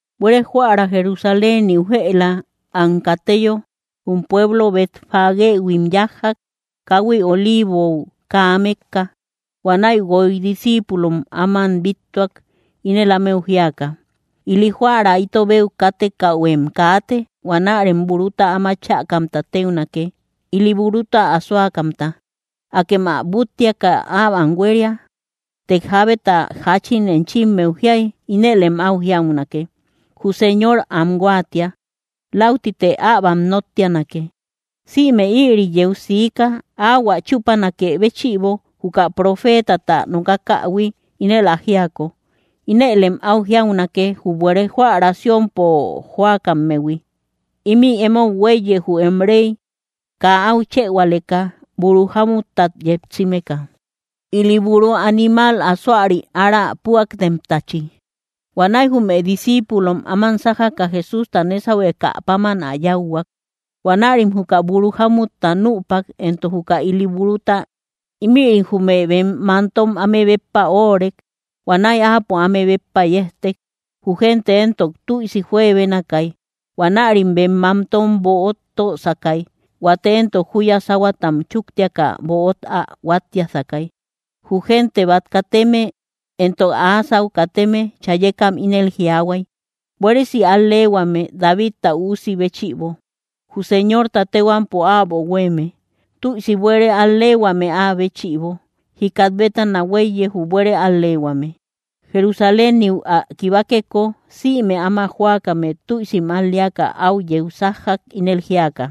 Buére jóära Jerusaléniu jëla am kateyo, jum pueblo Betfagéhuim yájjak, káhui Oliivou kaa mékka. Huanäi guoy discíipulom áman bíttuak, ínel ámeu jíaka: —Ili jóära itobeu kátekähuem kaate. Huanärem buruta áma chäkamta téunake, ili buruta jípuremta. Akem am búttiaka äbam huéria. Të jábeta jáchin enchimmeu jiay, ínëlem áu jiaunake: Jü Señor am huáatia; läutite äbam nóttianake. Sïme ïri yeu siika, áhuä chúpanakë béchïbo, juka profeetata nokakähui, ínel ä jíako: Inëlem áu jiaunake, jü buere jóära Siónpo jóakammehui: “Ímï emou huéiye, jü em réy, kaa áu chëhualeka, buru jámuttat yetsimeka, ili buuru animal asoari ára púaktemtachi.” Huanäi jume discíipulom áman sájaka, Jesústa nésahuekä páman ä yáuhuak. Huanärim juka buru jámutta nüpak, entok juka ili buruta; ímïrim jume bem mántom áme béppa óorek. Huanäi Áapo áme béppa yejtek. Jü gente éntok tüisi juebénakay. Huanärim bem mántom böot tösakay; huate éntok júya sáhuatam chúktiaka böot ä huáttiasakay. Jü gente bát kateme entok áa sáu kateme chayekam ínel jiaahuay: —¡Buéresi al‑leehuame Davidta Üusi béchïbo! ¡Jü Señorta téhuampo äbo huéeme, tüisi buére al‑leehuame áa béchïbo! ¡Jikat bétana huéiye, jü buére al‑leehuame! Jerusaléniu ä kibakeko, sïme áma jóakame tüisim al‑leaka áu yeu sájjak, ínel jíaka: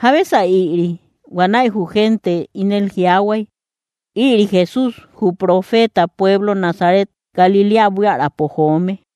—¿Jábesa ïri? Huanäi jü gente ínel jiaahuay: —Ïri Jesús, jü profeeta pueblo Nazaret Galiléa buiärapo joome.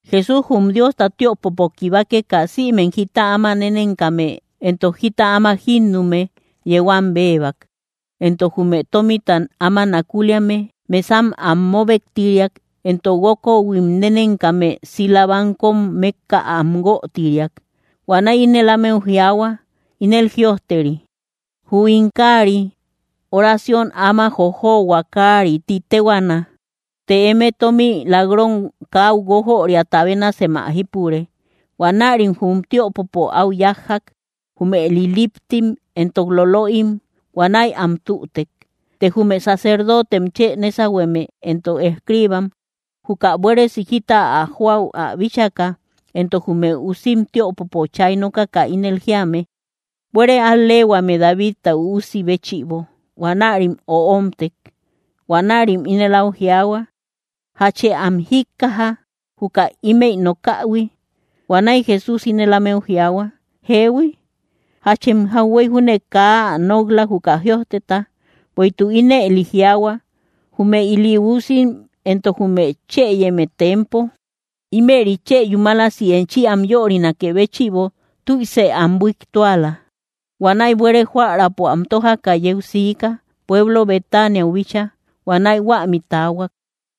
Jesús jum Diosta tiöpopo kibakeka, sïmem jita áma nénenkame entok jita áma jínnume yeu am béebak, entok jume tómita áma nakuliame mesam am móbektiriak, entok guókohuim nénenkame sila‑bankom mékka am huötiriak. Huanäi ínel ámeu jiaahua: —Ínel jïojteri: “Jü ín káari, oración áma jojohua kári ti téhuaana”; të eme, tómi lak‑ron káu guójoriata bénasem ä jípure. Huanärim jum tiöpopo áu yájjak, jume liliptim entok lolöim; huanäi am tütek. Të jume sacerdotem chë nésahueme entok escriibam, juka buéresi jita ä joäu ä bíchaka, entok jume usim tiöpopo chay nokaka ínel jíame: “¡Buére al‑leehuame Davidta Üusi béchïbo!”, huanärim öomtek. Huanärim ínel áu jiaahua: —¿Jachë am jíkkaja, juka ímëi nokähui? Huanäi Jesús ínel ámeu jiaahua: —Jeehui. ¿Jachem jauhuey júne kaa ä nok‑la, juka jïojteta? Bueïtuk ínëli jiaahua: Jume ili usim entok jume chëyeme tempo, ímëri chë yúmalasi enchi am yörinakë béchïbo tüise am buiktuala. Huanäi buére jóäraapo am tójaka yeu siika, pueblo Betaniau bíchaa; huanäi huämi taahuak.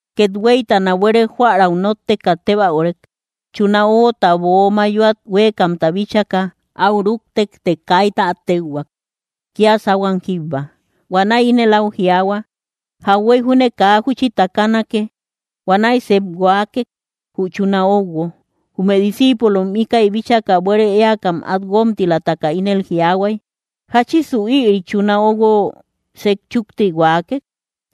Kethueytana buére jóärau nótteka tébäurek. Chuna óguota böo mayoat huéekamta bíchaka, áu rúktek; të kaita át téuhuak, kía sáhuam jíbba. Huanäi ínel áu jiaahua: —¡Jauhuey júne kaa júchi takanake! Huanäi sep huaakek, jü chuna óuguo. Jume discíipulom íkäi bíchaka, buére éakam át guómtilataka ínel jiaahuay: —¿Jáchisu ïri chuna óuguo sejchúkti huaakek?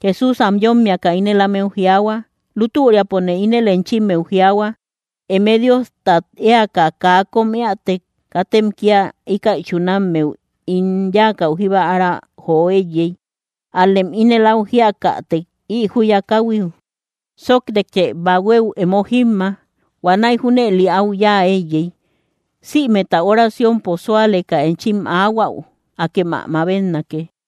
Jesús am yómmiaka ínel ámeu jiaahua: —Lútüriapone ínel enchimmeu jiaahua, eme Diostat éaka kaa kóm éätek, katem kía íkäi chunammeu ín yáakäu jíba ára jo éiyey; ál‑lem ínel áu jíakätek, ï júya káhuiu: “Sóoktekë bahuéu emo jímma”, huanäi junëli áu yáa éiyey. Sïmeta oraciompo súaleka enchim aahuäu, akem ä mabetnake.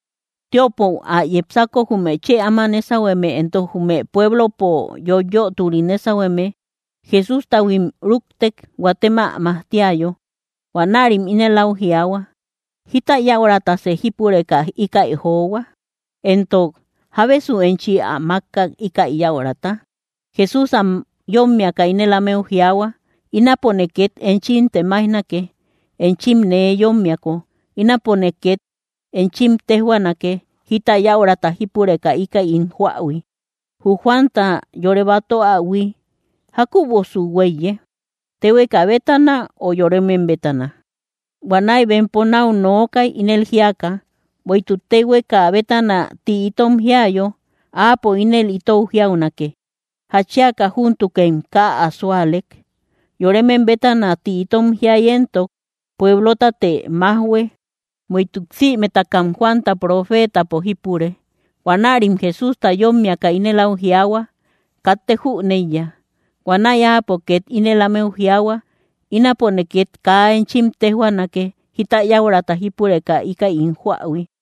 Tiöpou ä yepsako, jume chë áma nésahueme entok jume pueblopo yoiyöturi nésahueme Jesústahuim rúktek, huatem ä majtiayo. Huanärim ínel áu jiaahua: —¿Jíta yäuratasë jípureka íkäi johua? Entok, ¿jábesu enchi ä mákkak, íkäi yäurata? Jesús am yómmiaka ínel ámeu jiaahua: —Ínapone két enchim temaijnake. Enchim nee yómmiako, ínapone két enchim téjhuaanake, jita yäurata jípureka íkäi ín joähui. Jü Juanta yore batöahui, ¿jákübosu huéiye? ¿Téhueka bétana, ö yoremem bétana? Huanäi bempo náu nookay, ínel jíaka: —Bueïtuk téhueka bétana ti itom jiayo, Áapo ínel ítou jiaunake: “¿Jatchiaka júntukem kaa ä súalek?” Yoremem bétana ti itom jiay éntok, pueblotate májhue; bueïtuk sïmetakam Juanta profeetapo jípure. Huanärim Jesústa yómmiaka ínel áu jiaahua: —Katte jüneiya. Huanäi Áapo két ínel ámeu jiaahua: —Ínapone két kaa enchim téjhuaanake, jita yäurata jípureka íkäi ín joähui.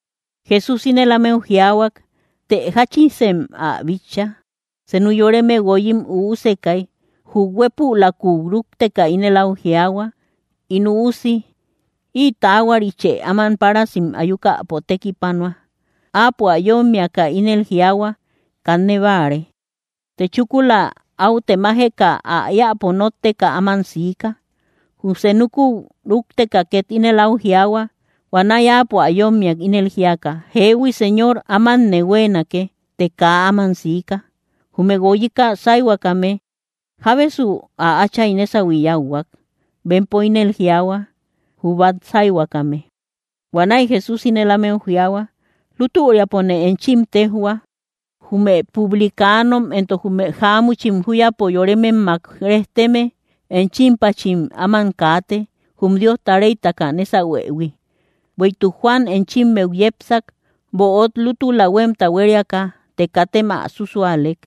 Jesús ínel ámeu jiaahuak: —Të, ¿jáchisem ä bitcha? Senu yoreme guoyim üusekay. Jü huépülakuu rúkteka ínel áu jiaahua: “In üusi, ï taahuarichë áman párasim ayukäpo tekipanua.” Áapo ä yómmiaka ínel jiaahua: “¡Kanne báare!” Të chúkula áu temajeka ä éäpo nótteka áman siika. Jü senukuu rúkteka két ínel áu jiaahua. Huanäi áapo ä yómmiak, ínel jíaka: “Jeehui, Señor, ámanne huéenake.” Të kaa áman siika. Jume guoyika sáihuakame, ¿jábesu ä áchay nésahui yáuhuak? Bempo ínel jiaahua: —Jü bát sáihuakame. Huanäi Jesús ínel ámeu jiaahua: —Lútüriapone enchim téjhua, jume publicanom entok jume jáamuchim júyapo yorememmak rejteme enchimpachim áman kaate, jum Diosta réytaka nésahuëhui. Bueïtuk Juan enchimmeu yepsak, böot lútula huémta huériaka; të katem ä susualek.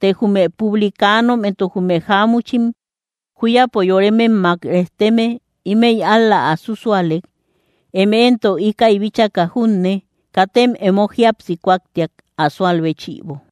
Të jume publicanom entok jume jáamuchim júyapo yorememmak rejteme, ímëi ál‑la ä susualek. Eme éntok íkäi bíchaka junne, katem emo jíapsi kúaktiak, ä súal béchïbo.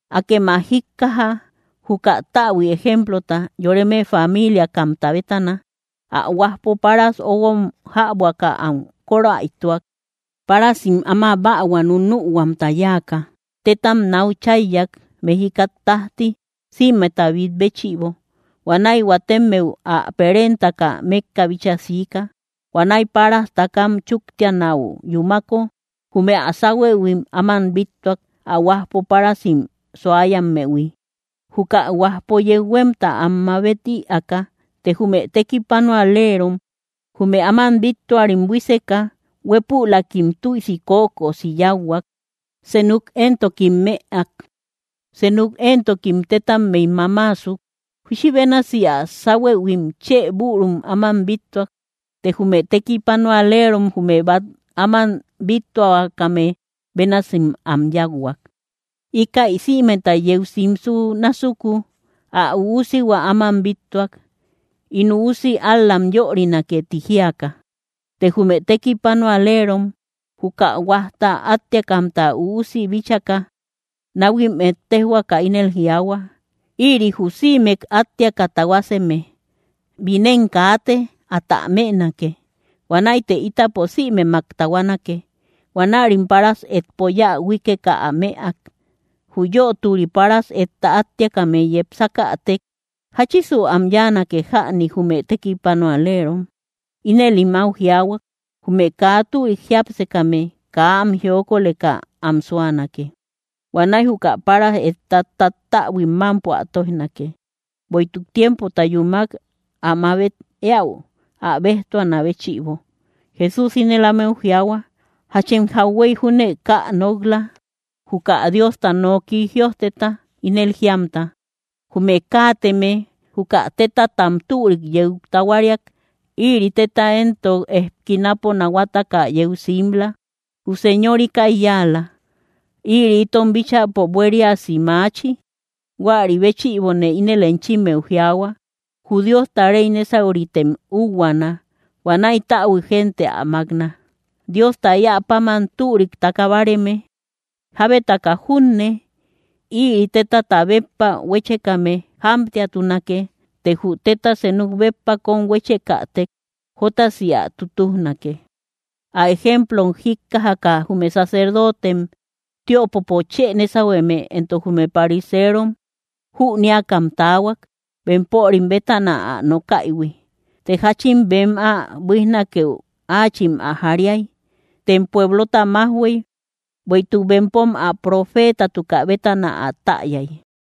’Akem ä jíkkaja, juka täbui ejemplota: Yoreme famiiliakamta bétana. Ä huajpo páras óuguom jäbuaka am kóräituak. Párasim áma bähua nunühuamta yáaka, tétam náu cháiyak, mejikat tájti sïmeta bít béchïbo. ’Huanäi huatemmeu ä perentaka, mékka bíchaa siika. Huanäi páras takam chúktianäu yúmako, jume ä sáhuëhuim áman bíttuak, ä huajpo párasim suayammehui, juka huajpo yeu huémta am mabet ïaaka. Të jume tekipanualerom jume áman bíttuarim buíseka, huépülakim tüisi kökosi yáuhuak; senuk éntokim mëak; senuk éntokim tétammey mámaasuk. Júchi bénasi ä sáhuëhuim chë bürum áman bíttuak; të jume tekipanualerom jume bát áman bíttuahuakame bénasim am yáuhuak. ’Íkäi sïmeta yeu simsü násuku, ä üusihua áman bíttuak: “In üusi ál‑lam yörinake”, ti jíaka. Të jume tekipanualerom, juka huajta áttiakamta üusi bíchaka, náhuim ettejhuaka ínel jiaahua: “Ïri jü sïmek áttiaka tahuaseme. Binem kaate; atä mënake. Huanäite ítapo sïmemak tahuanake.” Huanärim páras etpo yä huíkeka ä mëak. Jü yöturi páras etta áttiakame yepsakätek: —¿Jáchisu am yáanake jäni, jume tekipanualerom? Inëlim áu jiaahua: —Jume kaa türik jiápsekame, kaa am jiokoleka am súanake. Huanäi juka páras etta tattäbuim mámpo ä tóijnake, bueïtuk tiempota yúmak ä mabet éäu, ä béjtuanä béchïbo. Jesús ínel ámeu jiaahua: —¿Jachem jauhuey júne kaa ä nok‑la, juka Diosta noki jïojteta? Ínel jiamta: Jume káateme, juka tétatam türik yeu tahuariak. Ïri téta éntok ejkinapo nahuataka yeu simla. Jü Señor íkäi yáala. Ïri itom bíchäpo buériasi maachi. Huäri béchïbone ínel enchimmeu jiaahua, jü Diosta réy nésauritem úuhuana. Huanäi täbui gente ä mákna, Diosta éä páman türik taka báareme. Jábetaka junne, ïri tétata béppa huéchekame jámtiatunake; të jü téta senuk béppa kóm huéchekätek jótasi ä tutujnake. Ä ejemplom jíkkajaka jume sacerdotem tiöpopo chë nésahueme entok jume pariserom jünéakam taahuak, bempörim bétana ä nokaïhui. Të jáchin bem ä buíjnakeu áachim ä jariay; tem pueblota májhuey, bueïtuk bempom ä profeetatukä bétana ä täyay.